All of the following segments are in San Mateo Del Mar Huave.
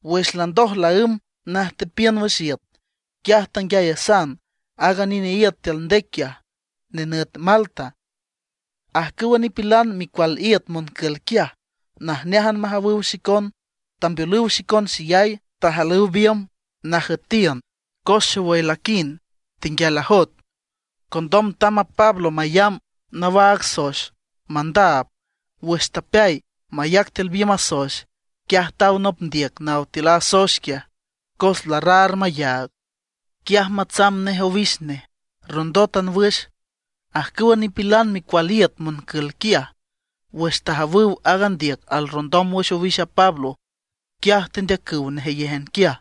Wüx landoj laǘmb najtepiün wüx iüt, quiaj tanguiayasan aaga nine iüt tiül ndec quiaj, nenüt Malta. Ajcüwa nipilan micual iüt moncül quiaj, najneájan majawüw xicon, tambeolüw xicon xeyay, tajalüw biümb najüetiün cos xowüy laquind, tenguial ajoet. Condom tamb a Pablo mayamb nawaag soex mandaab. Wüx tapeay mayac tiül biümb a soex, quiaj taw nop ndiüc naw tiül a soex quiaj, cos larraar mayaag. Quiaj matsamb nej owix nej, rondótan wüx. Ajcüwa nipilan micual iüt moncül quiaj, wüx tajawüw aaga ndiüc alrrondom wüx owix a Pablo, quiaj tendeacüw nejeyéjan quiaj,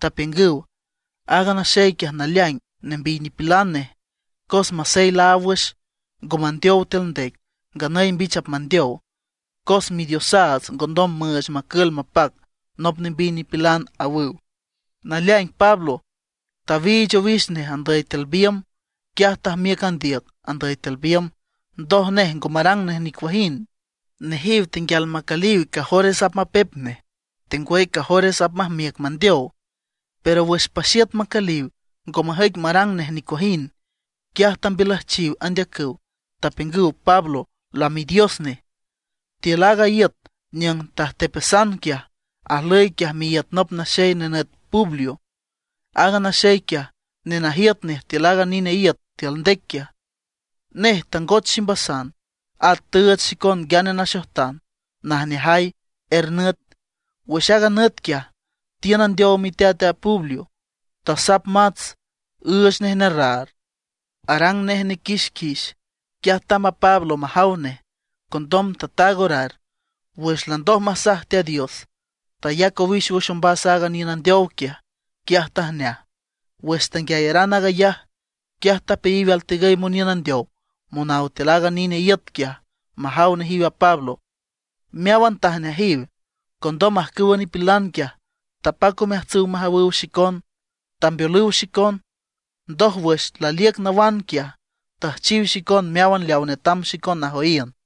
tapiüngüw: ―Aaga naxey quiaj naleaing nembiy nipilan nej. Cos masey laáw wüx, ngo mandeow tiül ndec, nganüy mbich apmandeow; cos midiosaats ngondom müüch macül mapac nop nembiy nipilan ―awüw. Naleaing Pablo tawiich owix nej andüy tiül biümb, quiaj tajmiüc a ndiüc andüy tiül biümb; ndoj nej ngo marang nej nicuajind. Nejiw tenguial macüliw cajores apmapep nej, tengwüy cajores apmajmiüc mandeow. Pero wüx paxiüt macüliw ngo majüic marang nej nicuajind; quiaj tambiülüjchiw andeacüw, tapiüngüw Pablo lamidios nej. Tiül aaga iüt niüng tajtepasan quiaj, ajlüy quiaj miíüt nop naxey nenüt Publio. Aaga naxey quiaj nenajiüt nej tiül aaga nine iüt tiül ndec quiaj. Nej tangoch ximbasan, at tüüch xicon nguiane naxojtan najneajay er nüt. Wüx aaga nüt quiaj tiün andeow miteat a Publio, tasap mats üüch nej nerraar, arang nej nequixquix. Quiaj tamb a Pablo majaw nej, condom tataag orar. Wüx landoj masaj Teat Dios, tayac owix wüx ombas aaga niün andeow quiaj, quiaj tajneaj. Wüx tanguiayaran aag ayaj, quiaj tapeayiw altigüy moniün andeow monaw tiül aaga nine iüt quiaj majaw nejiw a Pablo. Meáwan tajneajiw. Condom ajcüwa nipilan quiaj, tapac omeajtsüw majawüw xicon, tambeolüw xicon. Ndoj wüx laliüc nawan quiaj, tüjchiw xicon meáwan leaw netam xicon najoyiün.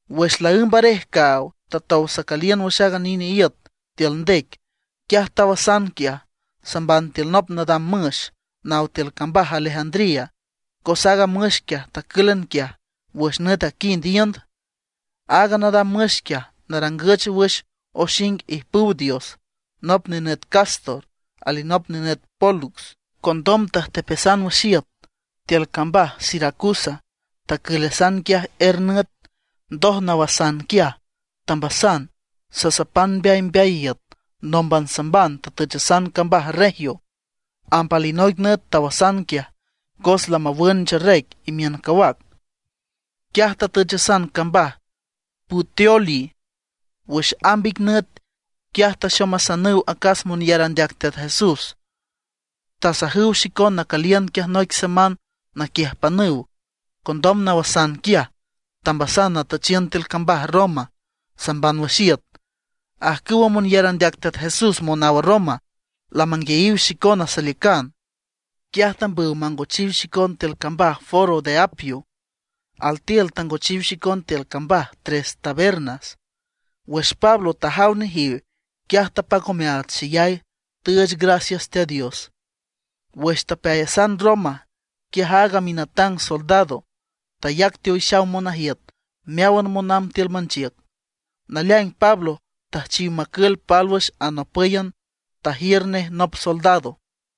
Wüx laǘmb arej caaw tatow sacüliün wüx aaga nine iüt tiül ndec, quiaj tawasan quiaj, samban tiül nop nadam müx naw tiül cambaj Alejandría, cos aaga müx quiaj tacǘlan quiaj wüx nüt aquind iünd. Aaga nadam müx quiaj narangüch wüx oxing ijpüw dios, nop nenüt Cástor alinop nenüt Pólux. Condom tajtepasan wüx iüt tiül cambaj Siracusa. Tacülasan quiaj er nüt. Ndoj nawasan quiaj, tambasan sasapan mbeaymbeay iüt, nómban samban tatüchasan cambaj Regio. Amb alinoic nüt tawasan quiaj, cos lamawün ncherec imiün cawac. Quiaj tatüchasan cambaj Puteoli wüx amb ic nüt. Quiaj taxomasanüw acas monyar andeac Teat Jesús, tasajüw xicon nacüliün quiaj noic semán naquiüjpanüw. Condom nawasan quiaj, tambasan natüchiün tiül cambaj Roma, samban wüx iüt. Ajcüwa monyar andeac Teat Jesús monaw Roma lamanguiayiw xicona saliücan, quiaj tambüw mangochiw xicon tiül cambaj Foro de Apio, altiül tangochiw xicon tiül cambaj Tres Tabernas. Wüx Pablo tajaw nejiw, quiaj tapac omeaats xeyay, tüüch gracias Teat Dios. Wüx tapeayasan Roma, quiaj aaga minatang soldado tayac teowixaw monajiüt meáwan monamb tiül manchiüc. Naleaing Pablo tüjchiw macül pálwüx anopǘyan, tajiür nej nop soldado.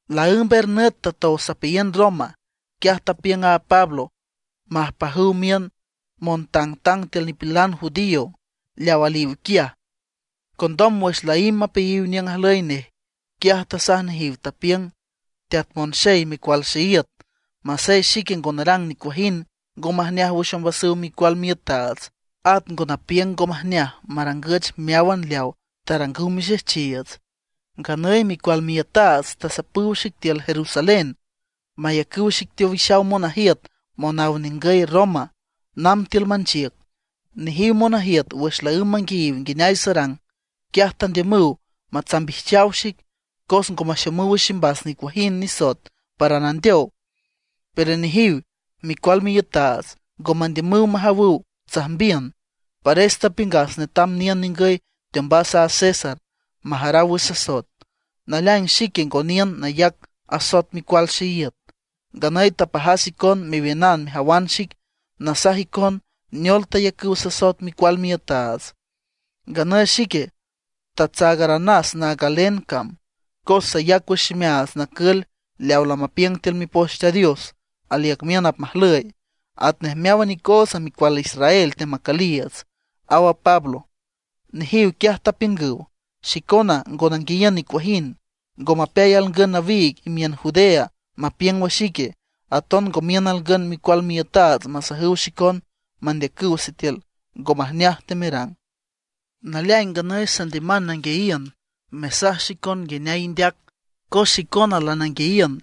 Laǘmb er nüt tatow sapeayiün Roma, quiaj tapiüng a Pablo majpajüw miün montangtang tiül nipilan judío leaw aliw quiaj. Condom wüx laímb mapeayiw niüng ajlüy nej, quiaj tasaj nejiw, tapiüng: ―Teat monxey micual xeíüt, masey xique ngo narang nicuajind ngo majneaj wüx ombasüw micual miiütaats, at ngo napiüng ngo majneaj marangüch meáwan leaw tarangüw mixejchiiüts, nganüy micual miiütaats tasapüw xic tiül Jerusalén, mayacüw xic teowixaw monajiüt monaw ningüy Roma namb tiül manchiüc. Nejiw monajiüt wüx laǘmb manguiayiw nguineay sarang, quiaj tandiümüw matsambijchaw xic, cos ngo maxomüw wüx ximbas nicuajind nisoet para nandeow. Pero nejiw micual miiütaats ngo mandiümüw majawüw tsajmbiün. Pares tapiüngas netam niün ningüy teombas a César majaraw wüx sasoet. Naleaing, xique ngo niün nayac asoet micual xeíüt. Nganüy tapajas icon mewiünan mejawan xic, nasaj icon neol tayacüw sasoet micual miiütaats. Nganüy xique tatsaagaranas naag a galen cam, cos sayac wüx ximeaats nacül leaw lamapiüng tiül Mipoch Teat Dios aliüc miün apmajlüy, atnej meáwan icootsa micual Israel teamacüliiüts ―aw a Pablo. Nejiw quiaj tapiüngüw: ―Xicona ngo nanguiayiün nicuajind, ngo mapeay alngün nawiig imiün Judea mapiüng wüx ique, aton ngo miün alngün micual miiütaats masajüw xicon mandeacüw sitiül ique ngo majneaj temerang. Naleaing nganüy sandiüman nanguiayiün mesaj xicon nguineay indeac. Cos xicona lananguiayiün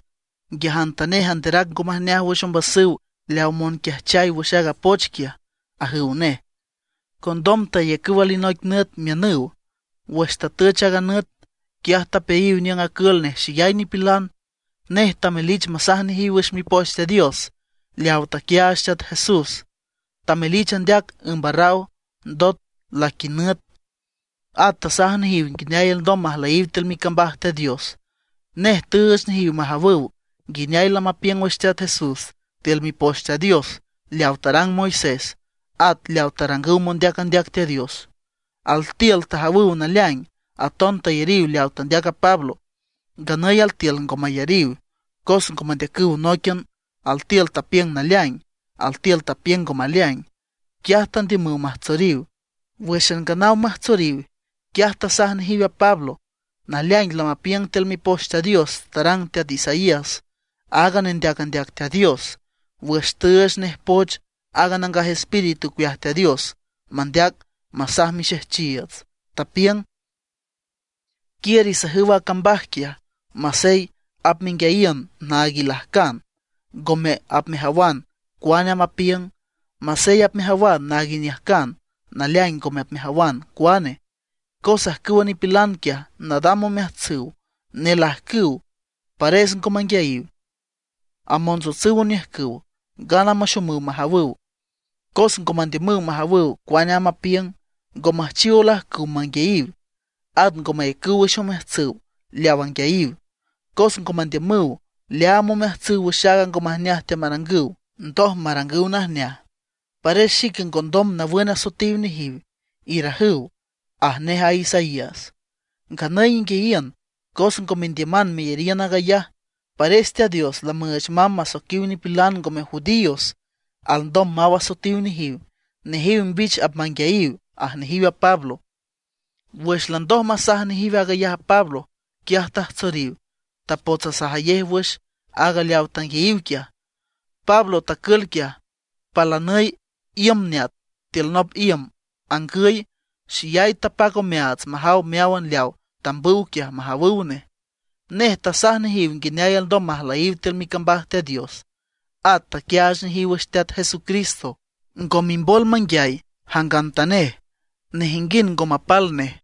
nguiajantanej anderac ngo majneaj wüx ombasüw leaw monquiajchay wüx aaga poch quiaj ―ajüw nej. Condom tayacüw alinoic nüt miünüw. Wüx tatüch aaga nüt, quiaj tapeayiw niüng acül nej xeyay nipilan. Nej tamelich masaj nejiw wüx Mipoch Teat Dios leaw taquiaach Teat Jesús, tamelich andeac ümb arraw, ndot laquinüt. At tasaj nejiw nguineay alndom majlüyiw tiül micambaj Teat Dios. Nej tüüch nejiw majawüw nguineay lamapiüng wüx Teat Jesús tiül Mipoch Teat Dios leaw tarang Moisés at leaw tarangüw mondeac andeac Teat Dios. Altiül tajawüw naleaing, aton tayariw leaw tandeac a Pablo; nganüy altiül ngo mayariw. Cos ngo mandeacüw nóiquian, altiül tapiüng naleaing, altiül tapiüng ngo maleaing; quiaj tandiümüw majtsoriw. Wǘxan nganaw majtsoriw, quiaj tasaj nejiw a Pablo: ―Naleaing lamapiüng tiül Mipoch Teat Dios tarang teat Isaías aaga nendeac andeac Teat Dios, wüx tüüch nej poch a Nangaj Espíritu ocueaj Teat Dios mandeac masaj mixejchiiüts. Tapiüng: Quiür isajüw a cambaj quiaj: Masey apmenguiayiün naag ilajcan, ngome apmejawan cuane amb apiüng. Masey apmejawan naag iniüjcan, naleaing ngome apmejawan cuane. Cos ajcüwa nipilan quiaj nadam omeajtsüw, nelajcüw, pares ngo manguiayiw, amontsotsüw oniüjcüw, gana maxomüw majawüw; cos ngo mandiümüw majawüw cuane amb apiüng, ngo müjchiw olajcüw manguiayiw, at ngo mayacüw wüx omeajtsüw leaw anguiayiw, cos ngo mandiümüw leaam omeajtsüw wüx aaga ngo majneaj teamarangüw, ndoj marangüw najneaj. Pares xique ngondom nawün asoetiw nejiw, irajüw, aj nej a Isaías. Nganüy inguiayiün, cos ngo mendiüman meyariün aag ayaj, pares Teat Dios lamüüch mamb masoiquiw nipilan ngome judíos alndom maw asoetiw nejiw. Nejiw mbich apmanguiayiw ―aj nejiw a Pablo. Wüx landoj masaj nejiw aag ayaj a Pablo, quiaj tajtsoriw, tapots asajayej wüx aag leaw tanguiayiw quiaj. Pablo tacül quiaj palanüy iüm neat tiül nop iüm angüy, xeyay tapac omeaats majaw meáwan leaw tambüw quiaj majawüw nej. Nej tasaj nejiw nguineay alndom majlüyiw tiül micambaj Teat Dios, at taquiaach nejiw wüx Teat Jesucristo, ngo mimbol manguiay jangantanej, nejinguind ngo mapal nej.